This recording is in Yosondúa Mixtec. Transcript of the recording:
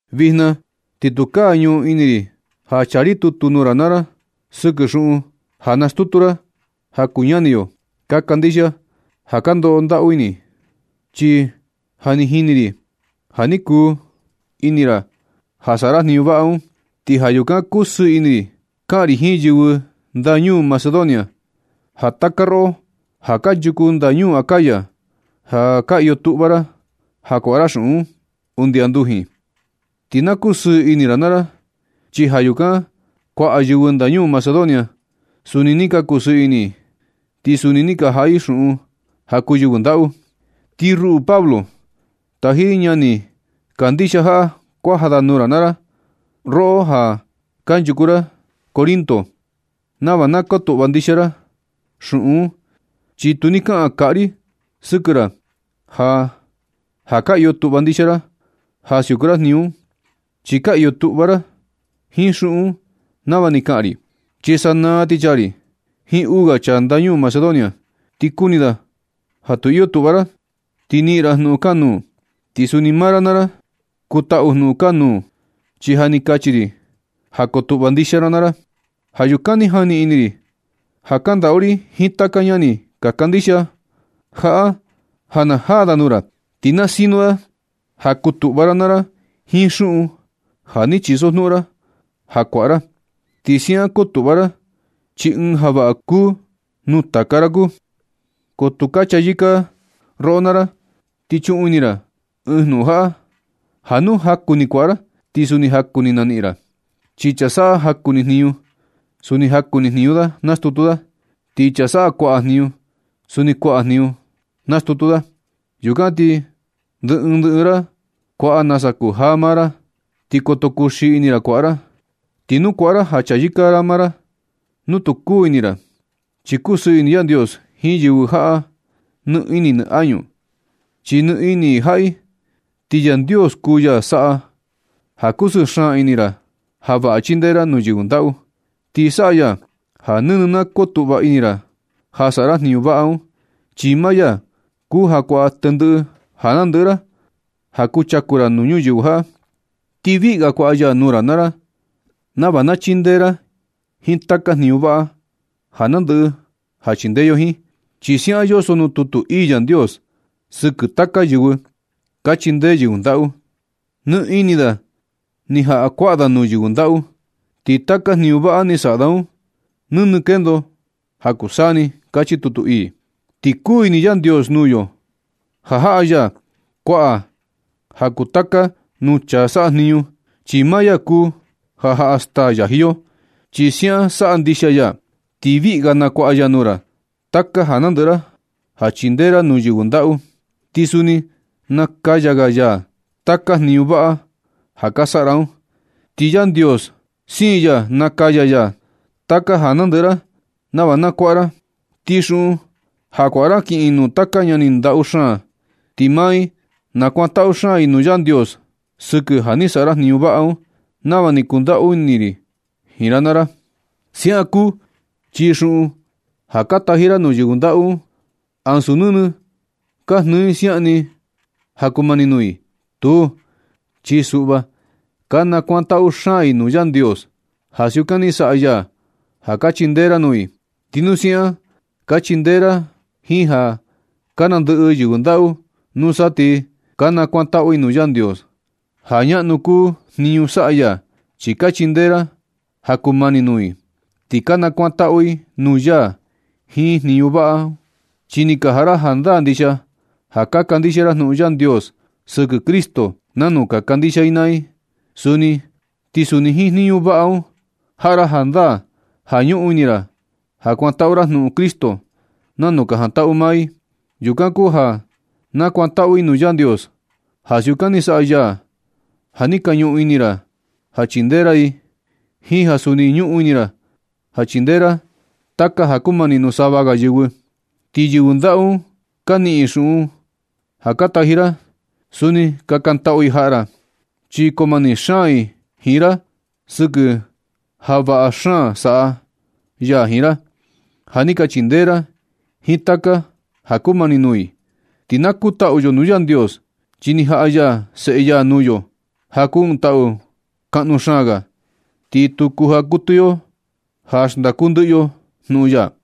Vijna ti tukaa ñuꞌun ini ri ja chaa ri tutu nuu ra naa ra sɨkɨ xuꞌun ja nastutu ra ja kuu ñani yo ka kandixia ja ka ndoꞌo ndaꞌu i. Chi ja ni jini ri ja ni kuu ini ra ja saꞌa ra jniñu vaꞌa un. Ti ja yukan kusɨɨ ini ri kaꞌan ri jiin yɨvɨ ndañuu Macedonia, ja taka roꞌo ja kanchuku ndañuu Acaya, ja ni ka iyo tuꞌva ra ja kuaꞌa ra xuꞌun un undi andujin. Ti na kusɨɨ ini ra naa ra, chi ja yukan kuaꞌa yɨvɨ ndañuu Macedonia, suni ni ka kusɨɨ ini i, ti suni ni ka jaꞌa i xuꞌun ja kuu yɨvɨ ndaꞌu. Ti ruꞌu Pablo, taji ri ñani kandixia jaꞌa kuaja da nuu ra naa ra, roꞌo ja kanchuku ra Corinto, nava na kotuꞌva ndixia ra xuꞌun un, chi tu ni kaꞌan kaꞌa ri sɨkɨ ra ja ja ka iyo tuꞌva ndixia ra ja siuku ra jniñu un. Chi ka iyo tuꞌva ra jiin xuꞌun un nava ni kaꞌan ri. Chi sanaa ti chaa ri jiin uu ga chaa ndañuu Macedonia, ti kuni da ja tu iyo tuꞌva ra, ti niꞌin ri jnuꞌun kanuū, ti suni maa ra naa ra kutaꞌu jnuꞌun kanuū, chi ja ni kachi ri ja kotuꞌva ndixia ra naa ra. Ja yukan ni jani ini ri ja kandaꞌu ri jiin taka ñani ka kandixia jaꞌa ja na jaa da nuu ra. Ti na sino da ja kutuꞌva ra naa ra jiin xuꞌun ja ni chisojnuꞌun ra ja kuaꞌa ra. Ti siaꞌan kotuꞌva ra, chi ɨɨn ja vaꞌa ja kuu nuu taka ra kuu, ko tu ja chayɨka yo roꞌo naa ra. Ti chuꞌun ini naa ra ɨɨn jnuꞌun jaꞌa, ja nu jaku ni na kuaꞌa ra ti suni jaku ni na niꞌin ra. Chi chaa saꞌa jaku ni jniñu, suni jaku ni jniñu da nastutu da. Ti chaa saꞌa kuaꞌa jniñu suni kuaꞌa jniñu da nastutu da. Yukan ti ndɨ ɨɨn ndɨ ɨɨn ra kuaꞌa nasa kujaa maa ra. Ti koto kuxii ini ra kuaꞌa ra, ni tu kuaꞌa ra ja chayɨka ra maa ra nu tu kuu ini ra. Chi kusɨɨ ini Yandios jiin yɨvɨ jaꞌa nɨ ini nɨ añu, chi nɨ ini i jaꞌa i. Ti Yandios kuu ya saꞌa ja kusɨɨ xaan ini ra ja vaꞌa chindee ra nuu yɨvɨ ndaꞌu. Ti saꞌa ya ja nɨnɨ na kotuꞌva ini ra ja saꞌa ra jniñu vaꞌa un, chi maa ya kuu ja kuaꞌa tendɨꞌɨ ja nandɨꞌɨ ra ja kuchaku ra nuu ñuyɨvɨ jaꞌa. Ti viꞌi ga kuaꞌa ya nuu ra nava na chindee ra jiin taka jniñu vaꞌa ja nandɨꞌɨ ja chindee yo jiin. Chi siaꞌan yoso nuu tutu ii Yandios sɨkɨ taka yɨvɨ ka chindee yɨvɨ ndaꞌu: Ni ini da ni jaꞌa kuaꞌa da nuu yɨvɨ ndaꞌu. Ti taka jniñu vaꞌa ni saꞌa da un, nɨnɨ kendo ja kuu taka saa ni. Kachi tutu ii. Ti kuu ini Yandios nuu yo ja jaꞌa ya kuaꞌa ja kuu tata nuu chaa saꞌa jniñu, chi maa ya kuu ja jaꞌa staa yaji yo. Chi siaꞌan saꞌa ndixia ya, ti viꞌi ga na kuaꞌa ya nuu ra taka ja nandɨꞌɨ ra ja chindee ra nuu yɨvɨ ndaꞌu. Ti suni nakaya ga ya taka jniñu vaꞌa ja ka saꞌa ra un. Ti Yandios siin ya nakaya ya taka ja nandɨꞌɨ ra nava na kuaꞌa ra. Ti xuꞌun ja kuaꞌa ra kiꞌin nuu taka ñani ndaꞌu xaan, ti maa i nakuantaꞌu xaan i nuu Yandios sɨkɨ ja ni saꞌa ra jniñu vaꞌa un, nava ni kandaꞌu ri jiin ra naa ra. Siaꞌan kuu, chi xuꞌun ja ka taji ra nuu yɨvɨ ndaꞌu un, ansu nɨnɨ ka jnɨɨ i siaꞌan ni ja kumani nuu i. Tuu, chi suꞌva ka nakuantaꞌu xaan i nuu Yandios ja siukan ni saꞌa ya ja ka chindee ra nuu i. Ti nu siaꞌan ka chindee ra jiin ja ka nandɨꞌɨ yɨvɨ ndaꞌu, nusa ti ka nakuantaꞌu i nuu Yandios ja ñaꞌnu kuu jniñu saꞌa ya, chi ka chindee ra ja kumani nuu i. Ti ka nakuantaꞌu i nuu ya jiin jniñu vaꞌa un, chi ni ka jaꞌa ra jandaa ndixia ja ka kandixia ra jnuꞌun Yandios sɨkɨ Cristo nanu ka kandixia i naa i suni. Ti suni jiin jniñu vaꞌa un jaꞌa ra jandaa ja ñuꞌun ini ra ja kuandatu ra jnuꞌun Cristo nanu ka jandatu maa i. Yukan kuu ja nakuantaꞌu i nuu Yandios ja siukan ni saꞌa ya ja ni ka ñuꞌun ini ra ja chindee ra i, jiin ja suni ñuꞌun ini ra ja chindee ra taka ja kumani nuu sava ga yɨvɨ. Ti yɨvɨ ndaꞌu un ka niꞌin i xuꞌun ja ka taji ra, suni kakantaꞌu i jaꞌa ra. Chi koo mani xaan i jiin ra sɨkɨ ja vaꞌa xaan saꞌa ya jiin ra, ja ni ka chindee ra i jiin taka ja kumani nuu i. Ti na kutaꞌu yo nuu Yandios, chi ni jaꞌa ya Seꞌe ya nuu yo ja kuu ɨɨn taꞌu kaꞌnu xaan ga, ti tu kujaa kuɨtɨ yo ja xndaku ndɨꞌɨ yo jnuꞌun ya.